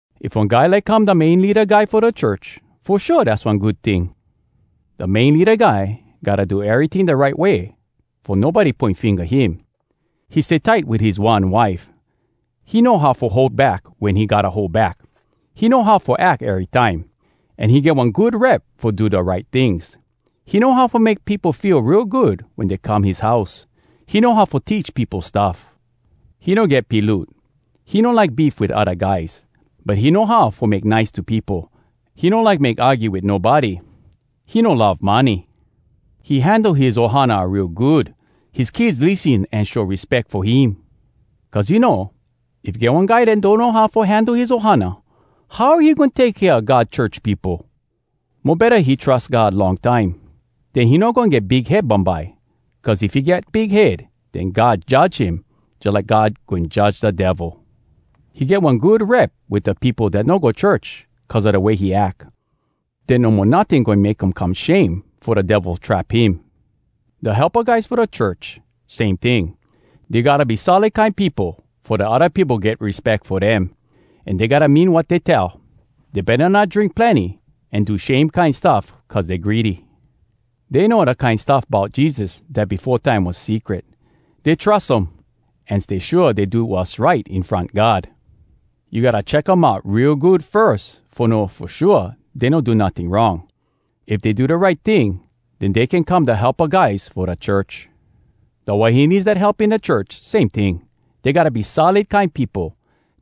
If one guy like come da main leada guy fo da church, fo shua dass one good ting. Da main leada guy gotta do eryting da right way fo nobody poin finga him. He stay tight wit his one wife. He know how fo hold back wen he gotta hold back. He know how fo ack erytime, an he get one good rep fo do da right tings. He know how fo make peopo feel real good wen dey come his house. He know how fo teach peopo stuff. He no get piloot. He no like beef wit odda guys, but he know how fo make nice to peopo. He no like make argue wit nobody. He no love money. He handle his ohana real good. His kids lissen an show respeck fo him. (Cuz you know, if get one guy dat donno how fo handle his ohana, how he goin take kea God church peopo?!) Mo betta he trus God long time, den he no goin get big head bumbye. Cuz if he get big head, den God judge him jalike God goin judge da Devil. He get one good rep wit da peopo dat no go church cuz a da way he ack. Den no mo notting goin make um come shame fo da Devil trap him. Da helpa guys fo da church, same ting. Dey gotta be solid kine peopo fo da odda peopo get respeck fo dem, an dey gotta mean wat dey tell. Dey betta not drink plenny an do shame kine stuff cuz dey greedy. Dey know da kine stuff bout Jesus dat befo time was secret. Dey trus um, an stay shua dey do wass right in front God. You gotta check um out real good firs fo know fo shua dey no do notting wrong. If dey do da right ting, den dey can come da helpa guys fo da church. Da wahines dat help in da church, same ting. Dey gotta be solid kine peopo.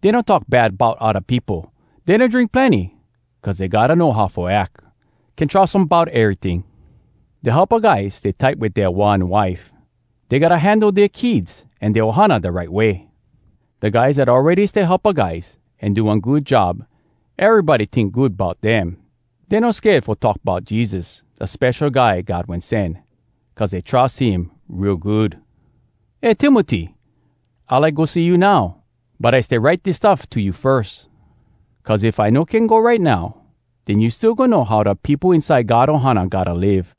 Dey no talk bad bout odda peopo. Dey no drink plenny cuz dey gotta know how fo ack. Can trus um bout eryting. Da helpa guys stay tight wit dea one wife. Dey gotta handle dea kids an dea ohana da right way. Da guys dat awready stay helpa guys, an do one good job, erybody tink good bout dem. Dey no sked fo talk bout Jesus, da Spesho Guy God Wen Sen, cuz dey trus him real good. Eh Timoty! I like go see you now, but I stay write dis stuff to you firs. Cuz if I no can go right now, den you still goin know how da peopo inside God ohana gotta live.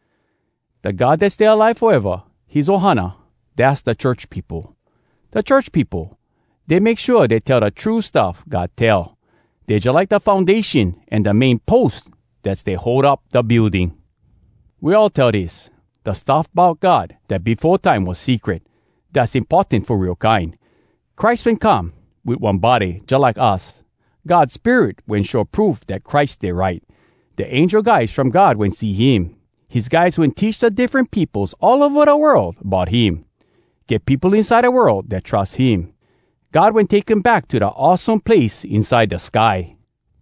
Da God dat stay alive foeva, his ohana, dass da church peopo. Da church peopo, dey make shua dey tell da true stuff God tell. Dey jalike da foundation an da main pos dat stay hold up da building. We all tell dis: Da stuff bout God, dat befo time was secret, dass importan fo real kine. Christ wen come, Wit one body jalike us. God Spirit wen show proof dat Christ stay right. Da angel guys from God wen see him. His guys wen teach Da diffren peopos all ova da world bout him. Get peopo inside da world dat trus him. God wen take him back To da awesome place inside da sky.